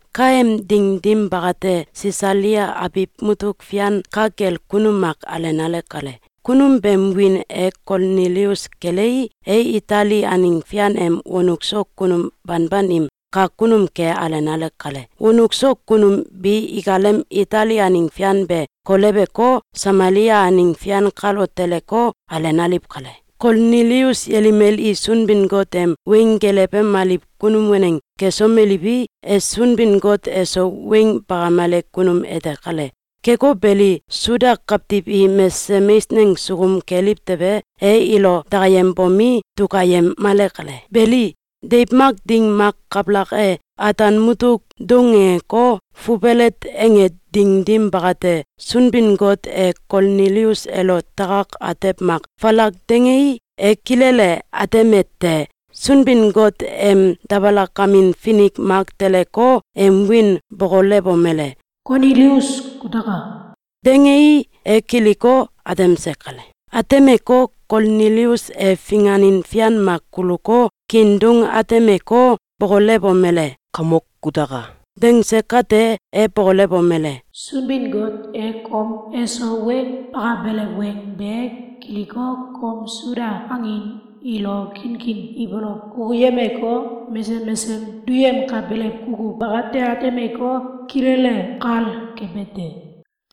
Kaem ding dim bakate, Sisalia abiw mutuk fian ka kel kunum mak alenale kale. Kunum beem wiin e Kolnilius kelei, e Itali aneng fian em wonuk so kunum banban im kak kunum ke alenale kale. Wonuk so kunum bi ikalem Itali aneng fian be koleweko, Samalia aneng fian kalo teleko, alenaliw kale. Kolnilius yelimel i Sunbin-Got em weng gelewemaliw kunum waneng kesomeliwi, e Sunbin-Got eso weng bakamele kunum ete kale. Keko beli, Suda kawtiw i mesesem eisneng sukum keliw tewe, e ilo dakayembomi, dukayemale kale. Beli, deiw mak ding mak kabalak e, ataan mutuk doungeko, fubelet ange ding dim bakate, Sunbin-Got e Kolnilius elo takak atew mak falak dangei, e kilele atemete: Sunbin-Got em dabalakamin finik mak teleko, em wiin bokolewomele: “Kolnilius kutaka!”, dangei, e kiliko, atemse kale. Atemeko, Kolnilius e finganin fian mak kuluko, kiin doung atemeko, bokolewomele: “Kamok kutaka!”, dangse kate, e bokolewomele: “Sunbin-Got e kom eso weng bakabelew weng be kiliko, kom Suda angin ilo kinkin ibolow kukuyemeko, mesesem mesesem duyemkabelew kukuw bakati atemeko, kilele kal kebe te.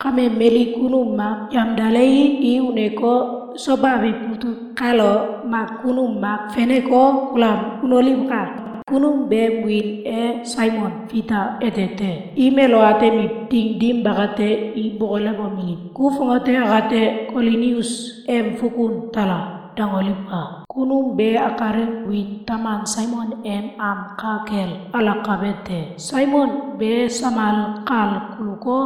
Kame, mali kunum mak yamdalewi, i uneko, Soba abiw mutuk kalo mak kunum mak feneko, kulam unoliwka! Kunum beem wiin e Saimon Fita ete te. Im elo atemiw ding dim bakate, i bokolewomeliw: ‘Ku fongate akate Kolnilius em fukun tala!’, dangoliwka! Kunum be akalem wiin taman Saimon em am ka kel alakabe te. Saimon be samal kal guluko,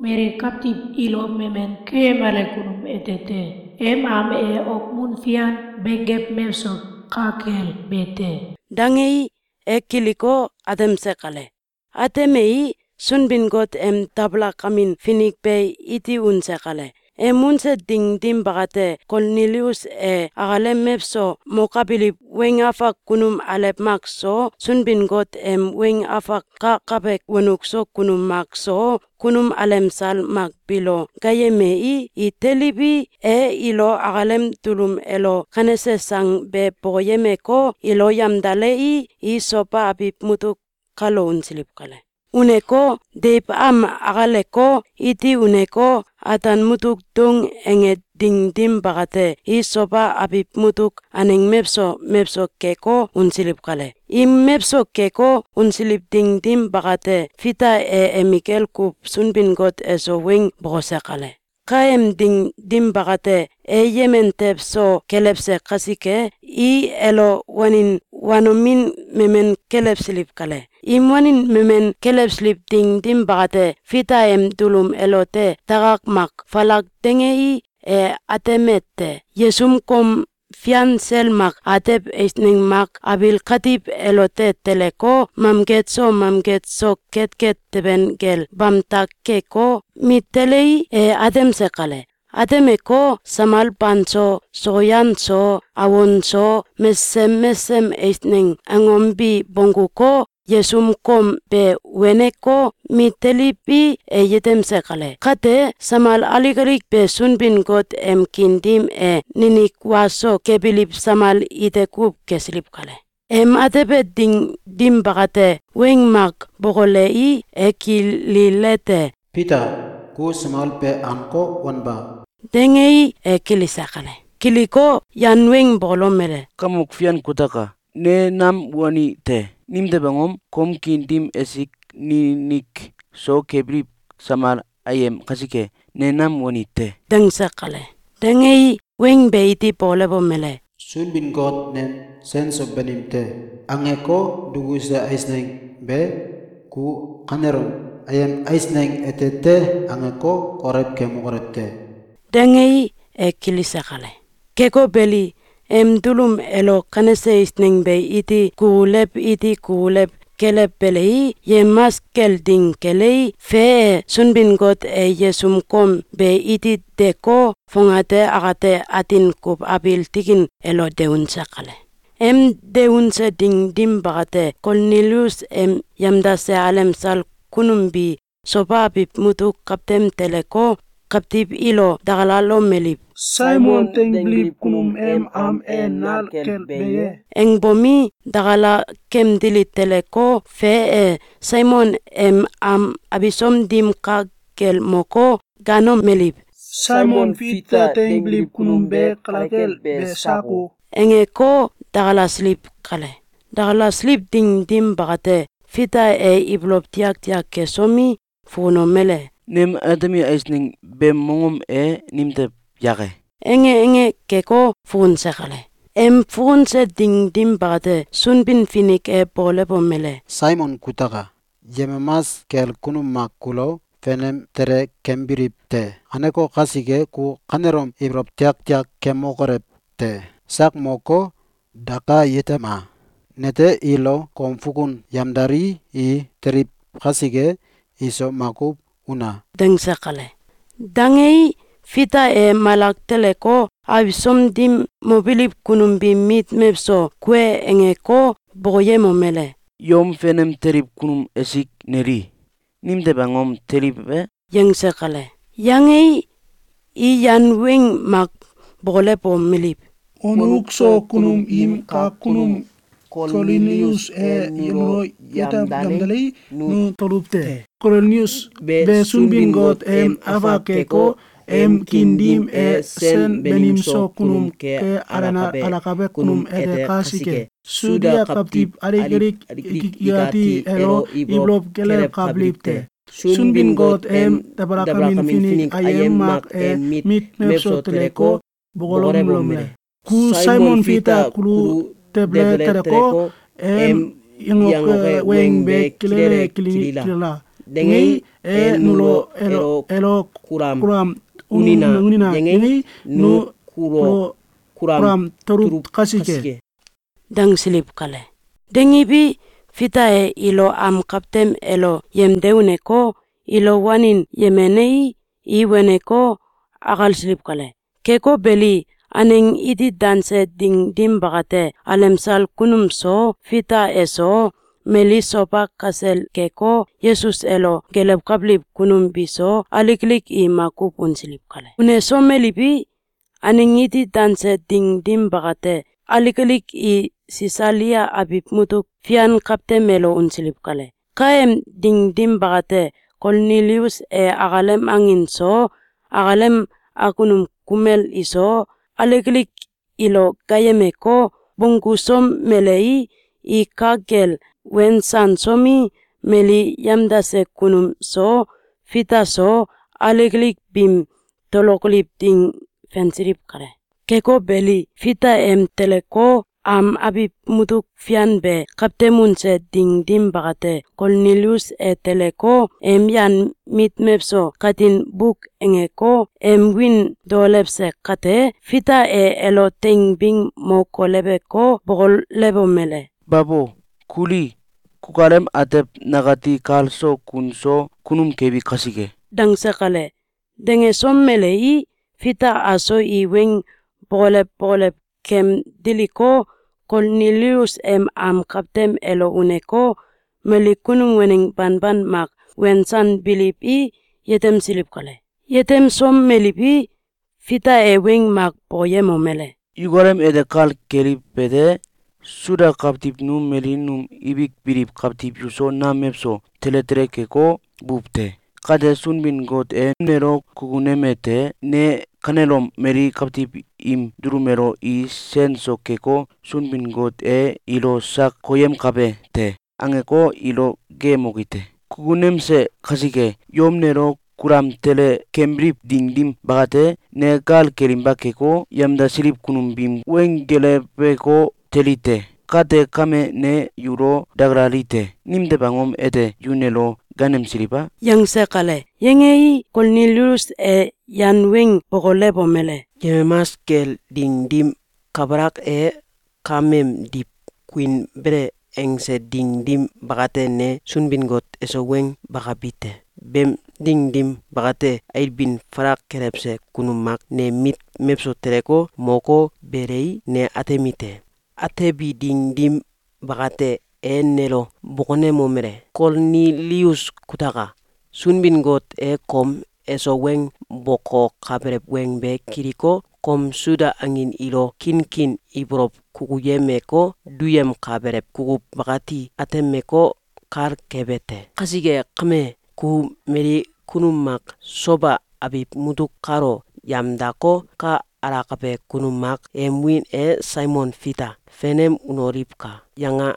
mali kawtiw ilo memen keyemale kunum ete te. Em am e okmun fian benggew mewso ka kel be te.”, dangei, e kiliko, atemse kale. Atemei, Sunbin-Got em dabalakamin finik be iti unse kale. Em unse ding dim bakate, Kolnilius e akalem mewso mokabiliw weng afak kunum alew mak so, Sunbin-Got em weng afak kakabe wonuk so kunum mak so, kunum alemsal mak biilo gaayemei, i teliwi, e ilo akalem dulum elo kanese sang be bokoyemeko, ilo yamdalei, i Soba abiw mutuk kalo unsiliw kale. Uneko, deiw am akaleko, iti uneko, ataan mutuk doung ange ding dim bakate, i Soba abiw mutuk aneng mewso mewso keko, unsiliw kale. Im mewso keko, unsiliw ding dim bakate, Fita e emikel kuw Sunbin-Got eso weng bokose kale. Kaem ding dim bakate, e yemen tew so kelewse kasike, i elo wanin wanomin memen kelewsiliw kale. Im wanin memen kelewsiliw ding dim bakate, Fita em dulum elote takak mak falak dangei, e atemete: Yesum kom fian sel mak atew eisneng mak abiil katiw elote teleko, mamget so mamget so ketket teben kel bamtak keko, mit telei, e atemse kale. Atemeko, samal banso, sokyan so, awon so, mesesem mesesem eisneng angom bi bongguko, yesum kom be weneko, mit teliwi, e yetemse kale. Kate, samal alik alik be Sunbin-Got em kiin dim e ninik wa so kebiliw samal ite kuw kesiliw kale. Em atebe ding dim bakate, weng mak bokolei, e kililete: “Fita! Ku samal be anko, wanba!”, dangei, e kilise kale. Kiliko, yan weng bokolomele: “Kamok Fian kutaka! Ne nam wani te! Nimtew angom? Kom kiin dim esik ninik so kebiliw samal ayem kasike, ne nam wani te.”, dangse kale. Dangei, weng be iti bokolewomele: “Sunbin-Got nem ‘Sen so banim te!’, angeko, dukuse eisneng be, ku kanelom ‘Ayem eisneng ete te!’, angeko, kolew kemokolew te!”, dangei, e kilise kale. Keko beli, em dulum elo kanese eisneng be iti kukulew iti kukulew kelewbelei, yemamas kel ding kelei, fe e, Sunbin-Got e yesum kom be iti deko, fongate akate atin kuw abiil tikin elo de unse kale. Em de unse ding dim bakate, Kolnilius em yamdase alemsal kunum bi Soba abiw mutuk kawtem teleko, kawtiw ilo dakalalomeliw: “Saimon dangbiliw kunum em am e nal kel be ye?”, angbomi, dakala kemdili teleko, fe e, Saimon em am abisom dim ka kel moko, gaanomeliw: “Saimon Fita dangbiliw kunum be kale kel be sako?”, angeko, dakalasiliw kale. Dakalasiliw ding dim bakate, Fita e ibolow tiaktiak kesomi, fukunomele: “Nem atemi eisneng beem mongom e nimtew yake?”, ange ange keko, fukunse kale. Em fukunse ding dim bakate, Sunbin-Finik e bokolewomele: “Saimon kutaka! Yemamas kel kunum mak kulo fenem tele kembiliw te. Kaneko kasike, ku kanelom ibolow tiaktiak kemokolew te! Sak moko, daka yetema! Nete ilo kom fukun yamdalii, i teliw kasike, iso makuw una!”, dangse kale. Dangei, Fita e malak teleko, abisom dim mobiliw kunum biim mit mewso kue angeko, bokoyemomele: “Yom fenem teliw kunum esik, neli! Nimtew angom teliw e?”, yangse kale. Yangei, i yan weng mak bokolewomeliw: “Wonuk so kunum im kak kunum Kolnilius e nulo yamdalei, nu tuluw te. Kolnilius be Sunbin-Got em afak keko, em kiin dim e sen banim so kunum ke alakabe kunum ete kasike, Suda kawtiw alik alik ikati elo ibolow kelewkabiliw te. Sunbin-Got em dabalakamin finik ayem mak em mit mewso teleko, bokolewomele: ‘Ku Saimon Fita kulu debele teleko, em yangoke weng be kilele kilila!’, dangei, e nulo ‘Elo kulam unina!’, yangei, nu kulo kulam tuluw kasike.”, dangsiliw kale. Dangiwi, Fita e ilo am kawtem elo yemde uneko, ilo wanin yemenei, i waneko, akalsiliw kale. Keko beli, aneng iti danse ding dim bakate, alemsal kunum so, Fita eso, mali Soba kasel keko, Yesus elo gelewkabiliw kunum biso, alik alik i makuw unsiliw kale. Unesomeliwi, aneng iti danse ding dim bakate, alik alik i Sisalia abiw mutuk fian kawtem elo unsiliw kale. Kaem ding dim bakate, Kolnilius e akalem angin so, akalem akunum kumel iso, alik alik ilo gaayemeko, bonggusomelei, i ka kel wensansomi, mali yamdase kunum so, Fita so, alik alik biim tolokoliw ding fensiliw kale. Keko beli, Fita em teleko, am abiw mutuk fian be kawtem unse ding dim bakate, Kolnilius e teleko, em yan mit mewso katin buk angeko, em wiin daolewse kate, Fita e elo teing bing mo koleweko, bokolewomele: “Babo! Kuli! Kukalem atew nakati kal so kun so kunum kebi kasike!”, dangse kale. Dangesomelei, Fita aso i weng bokolew bokolew kem diliko, Kolnilius em am kawtem elo uneko, mali kunum waneng banban mak wensanbiliwi, yetemsiliw kale. Yetemsomeliwi, Fita e weng mak bokoyemomele: “Yukalem ete kal keliwete: Suda kawtiw nu mali num ibik biliw kawtiw yuso nam mewso tele tele keko, buw te. Kate Sunbin-Got e nelo kukunemete: Ne kanelom mali kawtiw im dulum elo ‘I sen so keko, Sunbin-Got e ilo sak koyemkabe te!’, angeko, ilo geeyemoki te. Kukunemse kasike, yom nelo kulam tele kembiliw ding dim bakate, ne gal kelinba keko, yamdasiliw kunum biim weng geleweko, teli te. Kate kame, ne yulo dakalalite: Nimtew angom ete yu nelo gaanemsiliw a?”, yangse kale. Yangei, Kolnilius e yan weng bokolewomele: “Yemamas kel ding dim kabalak e, kameemdiw kuinbele angse ding dim bakate, ne Sunbin-Got eso weng bakabi te. Beem ding dim bakate, ailbin falal kelewse kunum mak nem mit mewso teleko, moko, belei, ne atemi te. Atebi ding dim bakate, e nelo bokonemomele: ‘Kolnilius kutaka! Sunbin-Got e kom eso weng bokokabelew weng be kiliko, kom Suda angin ilo kinkin ibolow kukuyemeko, duyemkabelew kukuw bakati atemeko, kal kebe te. Kasike kame, ku mali kunum mak Soba abiw mutuk kalo yamdako, ‘Ka alakabe kunum mak em wiin e Saimon Fita fenem unoliwka!’, yanga!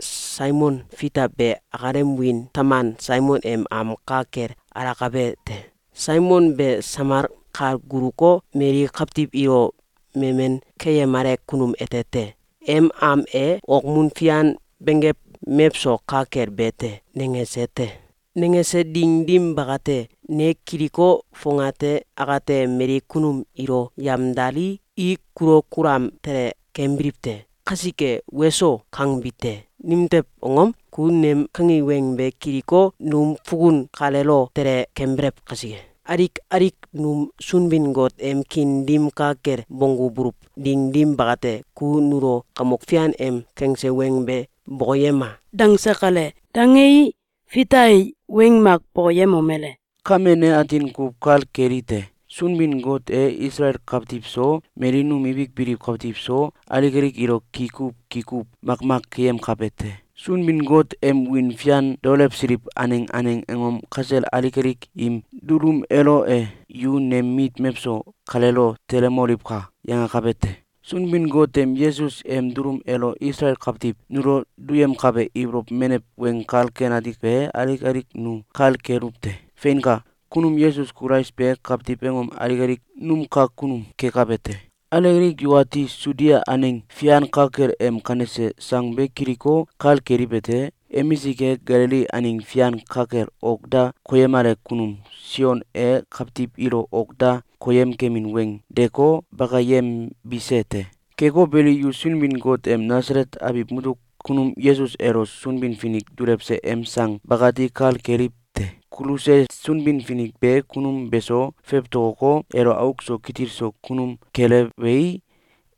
Saimon Fita be akalem wiin taman Saimon em am ka kel alakabe te. Saimon be samal kal guluko, mali kawtiw ilo memen keyemale kunum ete te. Em am e okmun fian benggew mewso ka kel be te.’, nangese te. Nangese ding dim bakate, ne kiliko, fongate akate mali kunum ilo yamdalii, i kulo kulam tele kembiliw te. Kasike ‘Weso!’, kangbi te. Nimtew angom? Ku nem kangi weng be kiliko, num fukun kaleelo tele kembelew kasike. Alik alik num Sunbin-Got em kiin dim ka kel bonggubuluw ding dim bakate, ku nulo Kamok Fian em kangse weng be bokoyema!”, dangse kale. Dangei, Fita e weng mak bokoyemomele: “Kame ne atin kuw kal kelite: Sunbin-Got e Isalael kawtiw so, mali num ibik biliw kawtiw so, alik alik ilo ki kuw ki kuw makmak keyemkabe te. Sunbin-Got em wiin fian daolewsiliw aneng aneng angom kasel alik alik im dulum elo e ‘Yu nem mit mewso kaleelo telemoliwka!’, yangakabe te. Sunbin-Got em Yesus em dulum elo Isalael kawtiw nulo duyemkabe ibolow menew Weng Kal Ken Ati be alik alik nu kal keluw te. Feinka! Kunum Yesus Kulais be kawtiw angom alik alik num kak kunum kekabe te. Alik alik yukati Sudia aneng fian ka kel em kanese sang be kiliko, kal keliwete: Emisik e, Galili aneng fian ka kel ok da koyemale kunum Sion e kawtiw ilo ok da koyem kemin weng deeko, bakayembise te. Keko beli, yu Sunbin-Got em Nasalet abiw mutuk kunum Yesus elo Sunbin-Finik dulewse em sang bakati kal keliw te. Kuluse Sunbin-Finik be kunum beso fewtokoko, elo auk so kitil so kunum kelewei,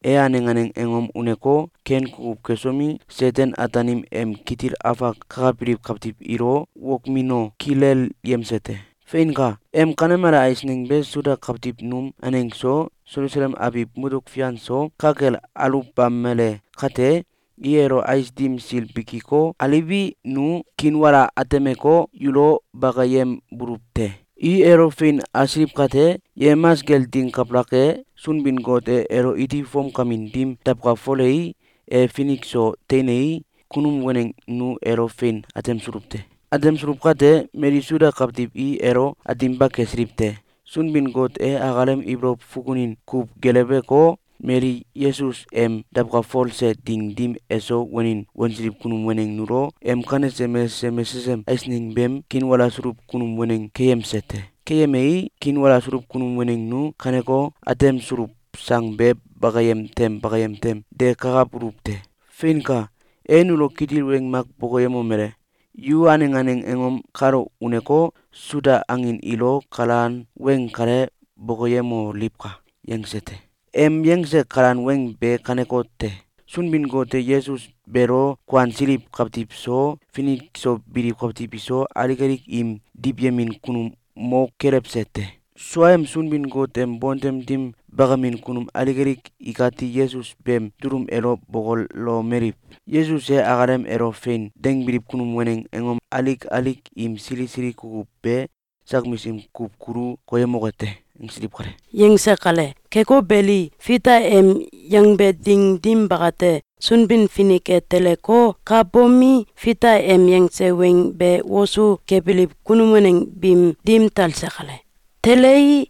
e aneng aneng angom uneko, ken kukuw kesomi, Seten-Ataanim em kitil afak kakabiliw kawtiw ilo wokmino, kilelyemse te. Feinka! Em kanemale eisneng be Suda kawtiw num aneng so, Selusalem abiw mutuk fian so, ka kel aluwbamele kate, i elo ais dim sil bikiko, aliwi, nu kiinwala atemeko, yulo bakayembuluw te. I elo fein asiliw kate, yemamas kel ding kabalak e, Sunbin-Got e elo iti fomkamin dim dawkalfolei, e finik so teinei, kunum waneng nu elo fein atemsuluw te. Atemsuluw kate, mali Suda kawtiw i elo ateminba kesiliw te. Sunbin-Got e akalem ibolow fukunin kuw geleweko, mali Yesus em dawkalfolse ding dim eso wanin wansiliw kunum waneng nulo em kanese mesesem mesesem eisneng beem kiinwalasuluw kunum waneng keyemse te. Keyemei, kiinwalasuluw kunum waneng nu kaneko, atemsuluw sang be bakayem tem bakayem tem de kakabuluw te. Feinka! E nulo kitil weng mak bokoyemomele: ‘Yu aneng aneng angom kalo uneko, Suda angin ilo kalan weng kale bokoyemoliwka!’, yangse te. Em yangse kalan weng be kanekote: Sunbin-Got e Yesus beelo kuansiliw kawtiw so, finik so biliw kawtiw iso, alik alik im diwyemin kunum mo kelewse te. Sua em Sunbin-Got em bontem dim bakamin kunum alik alik ikati Yesus beem dulum elo bokolomeliw: ‘Yesus e akalem elo ‘Fein!’, dangbiliw kunum waneng angom alik alik im sili sili kukuw be sak misim kuw kulu koyemoke te.’, angsiliw kale.”, yangse kale. Keko beli, Fita em yangbe ding dim bakate, Sunbin-Finik e teleko, ka bomi, Fita em yangse weng be wosu kebiliw kunum waneng biim dim talse kale. Telei,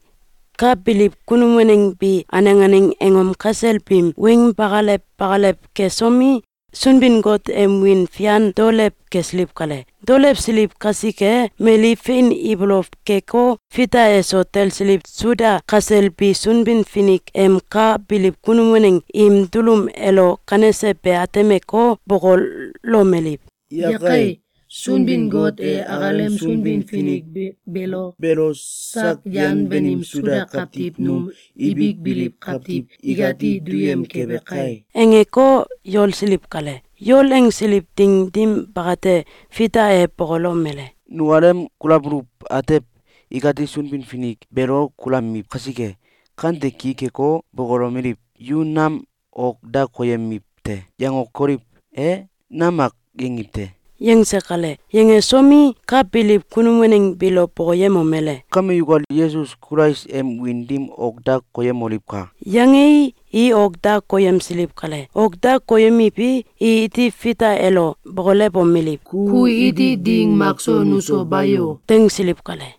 ka biliw kunum waneng bi aneng aneng angom kasel biim weng bakalew bakalew kesomi, Sunbin-Got em wiin fian daolew kesiliw kale. Daolewsiliw kasike, mali fein ibolow keko, Fita eso talsiliw Suda kasel bi Sunbin-Finik em ka biliw kunum waneng im dulum elo kanese be atemeko, bokolomeliw: “Yakai! Sunbin-Got e akalem Sunbin-Finik beelo sak yan banim Suda kawtiw num ibik biliw kawtiw ikati duyem kebe kai!”, angeko, yolsiliw kale. Yol angsiliw ding dim bakate, Fita e bokolomele: “Nukalem kulabuluw atew, ikati Sunbin-Finik beelo kulamiw kasike, kante ki keko, bokolomeliw: ‘Yu nam ok da koyemiw te!’, yangokoliw e? Nam mak yangiw te!”, yangse kale. Yangesomi, ka biliw kunum waneng biilo bokoyemomele: “Kame yukal Yesus Kulais em wiin dim ok da koyemoliwka!”, yangei, i ok da koyemsiliw kale. Ok da koyemiwi, i iti Fita elo bokolewomeliw: “Ku iti ding makso nuso bayo!”, dangsiliw kale.